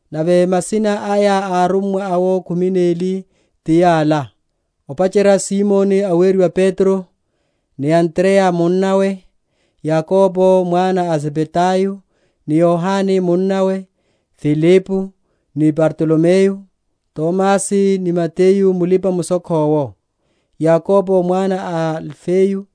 Nave masina aya a arummwa awo khumi neli ti yala: ópacherya Simoni aweriwa Petro, ni Andreya munnawe: Yakobo mwana a Zebedayo ni Yohane munnawe; Filipo, ni Bartolomeyo; Tomasi ni Mateyu mulipa‐mushokho’wo; Yakobo mwana a Alifeyo,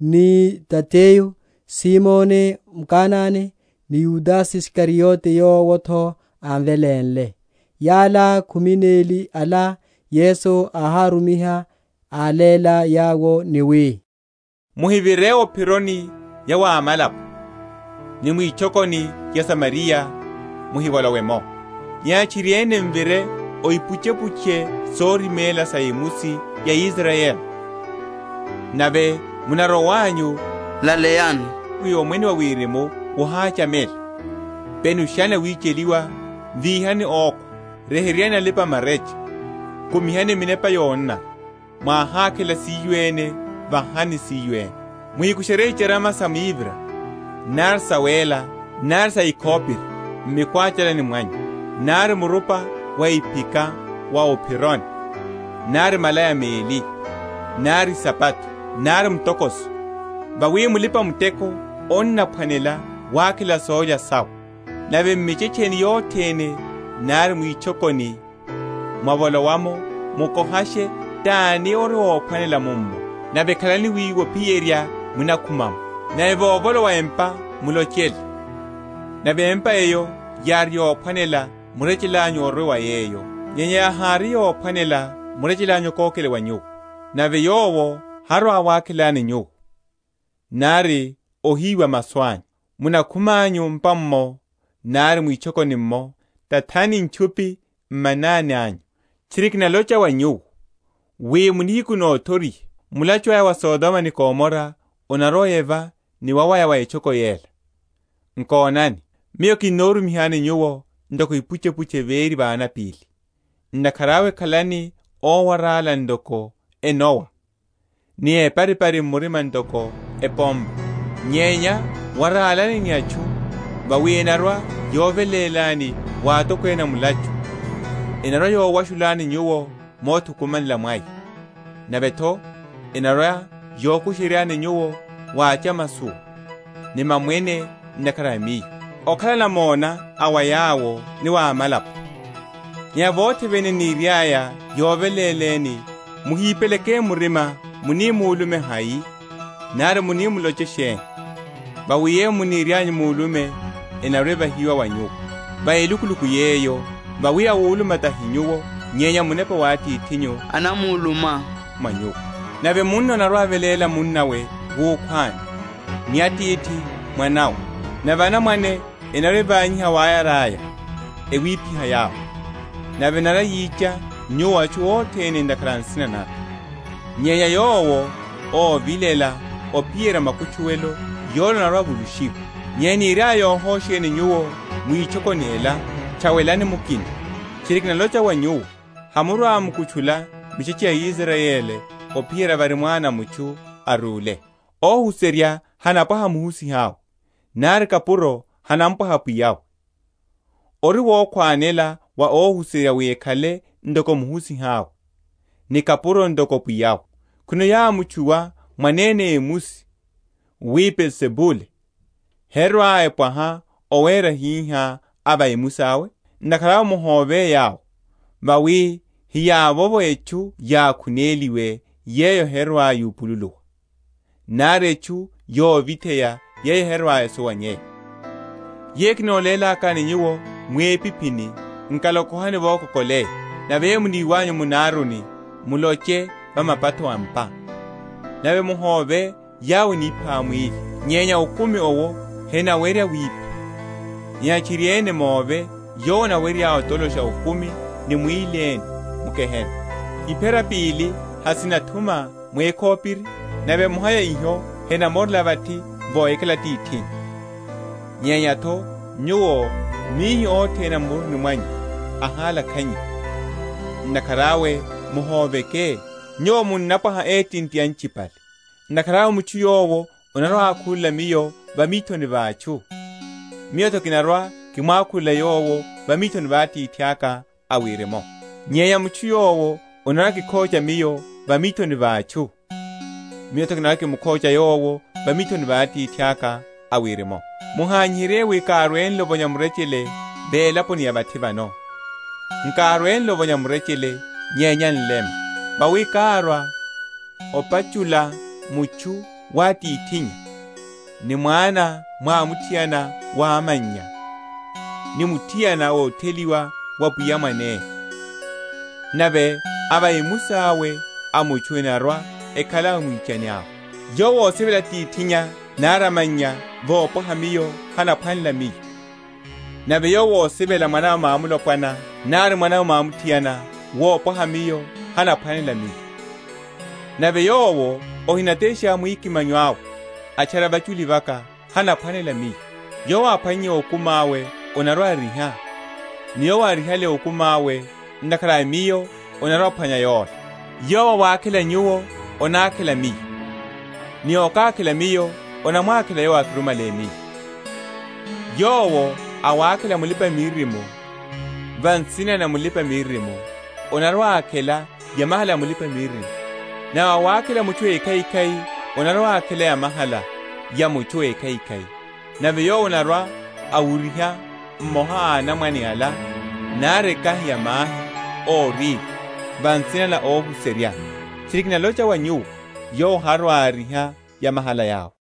ni Tadeyo; Simoni Mkanane, ni Yudase Isikariote yowo’tho ámvelénle. Yala, khumi neli ala, Yesu áhárumiha, áléla yawo ni wi; Muhivire o’phironi ya wa amalapo, ni mwitchokoni ya aSamariya muhivolowe’mo: nyenya tchiriene muvire o ipuchepuche sorimela sa emusi ya Israyeli. Nave munarowanyu, laleyani, wi, Omwene wa Wirimu wohachamela. Penushani awicheliwa, víhani ókhwa, ryeheryani alipa‐marecha, kumihani minepa yonanara. Mwáhákhela siyo ene, vahani siyo ene. Muhíkusherye icharama sa mivira, nari sawéla, nari sa ekhopiri, m’mikwachalani mwanyu; nari murupa wa iphika wa o’phironi, nari malaya meli, nari isapato, nari mutokoso: vawi mulipa‐muteko anaphwanela wakhela sólya sawe. Nave m’michetcheni yothene nari mwitchokoni, mwavolowa’mo, mukohashe tani ori ophwanela mummo; nave khalaniru wiwo ophiyerya munakhuma’mo. Nave vovolowa empa mulochele. Nave empa’eyo yári yophwanela, murechele anyu orwe va yeyo, nyenya yáhiri yophwanela, murechele anyu okokele wa nyuwo. Nave yowo harwa‐awakhelani nyuwo, nari ohiwa masu anyu, munakhumanyu m’pa’mmo, nari mwitchokoni’mmo, tathani ntchupi m’manani anyu. Tchiri kinalocha wa nyuwo, wi, mu nihiku nothoriha, mulachu aya wa Sodoma ni Gomora onarwa‐oyeva ni wawaya wa etchoko yela. Nkonani, Miyo kinorumihani nyuwo ntoko ipuchepuche véri va anapíli: ntakhara awe khalani ówarála ntoko enowa, ni éparipari murima ntoko epompa. Nyenya warálani ni atchu; vawi enarwa‐yovelélani wa atokwene a mulachu; enarwa‐yowashulani nyuwo mothukumanela mwaya; nave’tho enarwa‐yokushe?-?ryani nyuwo wa achamasowa ni mamwene ntakhara a Miyo, okhala namona a wa yawo, ni wa amalapo. Nyenya vothe vene eniriaya yoveléleni, muhipeleke murima munulume hai nari munaloche sheni; vawi yeyo muniryanyu mulume, enarwa‐evahiwa wa nyuwo, va elukuluku yeyo; vawi awuluma tahi nyuwo, nyenya Munepa wa Atithinyu anamuluma mwa nyuwo. Nave munna anarwa‐aveléla munnawe wukhwani, ni atithi mwanawe: nave anamwane enarwa‐evanyiha awayara’ya, ewiphiha yawo. Nave enarwa‐yicha nyuwo atchu othene ntakhara a nsina naka; nyenya yowo óvilela ophiyerya makutchuwelo, yola anarwa‐avulushiwa. Nyenya eniryaya yohosheni nyuwo mwitchokoni ela, tchawelani mukina: tchiri kinalocha wa nyuwo, Hamurwa‐mukutchula michetche ya Israyeli, ophiyerya vári Mwana a mutchu arwile. Óhuserya hanapwaha muhusiha’we, nari kapuro hanapwaha pwiya’we. Ori wokhwanela wa óhuserya wi akhale ntoko muhusiha’we, ni kapuro ntoko pwiya’we. Khwino yámutchuwa mwanene emusi, wi, Beelzebule, herwa‐epwaha owera hihá a va emusi awe? Ntakhara awe muhove yawo; vawi hiyavovo etchu yákhuneliwe, yeyo herwa‐yupululiwa; nari etchu yovitheya, yeyo herwa‐esuwanyeya. Yeyo kinolélakani nyuwo mwipiphini, nkalokohani vokokoleya: nave yeyo muniwanyu mu naruni, muloche va mapatho a’mpa. Nave muhove yawo enipha mwíli, nyenya okumi owo henawerya wipha; nyenya tchiriene move Yowo, ówerya otolosha okumi ni mwíli ene m’gehena. Iphera pili hasinathuma mwékhopiri? nave emoha ya hiho henamorela vathi vohikhala Atithinyu: nyenya’tho nyuwo, mihi othene a m’muruni mwanyu ahálakhanyiwa. Ntakhara awe muhoveke; nyuwo munnapwaha étinti anchipale. Ntakhara awe mutchu yowo anarwa‐ákhulela Miyo va mithoni va atchu, Miyo’tho kinarwa‐kimwákhulela yowo va mithoni va Atithaka a Wirimu. Nyenya mutchu yowo anarwa‐akikhocha Miyo va mithoni va atchu, Miyo’tho kinarwa‐kimukhocha yowo va mithoni va Atithaka a Wirimu. Muhanyiherye wi kárwele ovonya murechele va elaponi ya vathi vano; nkárwele ovonya murechele, nyenya nlema. Vawi kárwa opachula mutchu wa atithinnya, ni mwana mwamuthiana wa amannya, ni muthiana ótheliwa wa apwiya mwanawe: nave a va emusi awe a mutchu enarwa‐ekhala amwichani awe. Yowo ósivela atithinnya, nari amannya wopwaha Miyo, hanaphwanela Miyo, nave yowo ósivela mwanawe mwamulopwana, nari mwanawe mwamuthiana wopwaha Miyo, hanaphwanela Miyo. Nave yowo ahinatesha mwikimanyo awe, atchara vachuli vaka, hanaphwanela Miyo. Yowo áphwannye okumi awe, anarwa‐ariha; ni yowo árihale okumi awe, ntakhara a Miyo, anarwa‐aphwanya yola. Yowo awakhela nyuwo, anakhela Miyo, ni ókákhela Miyo, anamwakhela Yowo ákirumihale Miyo. Yowo awakhela mulipa‐miririmo, va nsina na mulipa‐miririmo, anarwa‐akhela yamahala ya mulipa‐miririmo; nave awakhela mutchu ékhaikhai, anarwa‐akhela yamahala ya mutchu ékhaikhai. Nave yowo anarwa‐awuryiha mmoha a anamwane ala, nari ekahi ya mahi órirya, va nsina na óhuserya, tchiri kinalocha wa nyuwo, yowo harwa‐ariha yamahala yawe.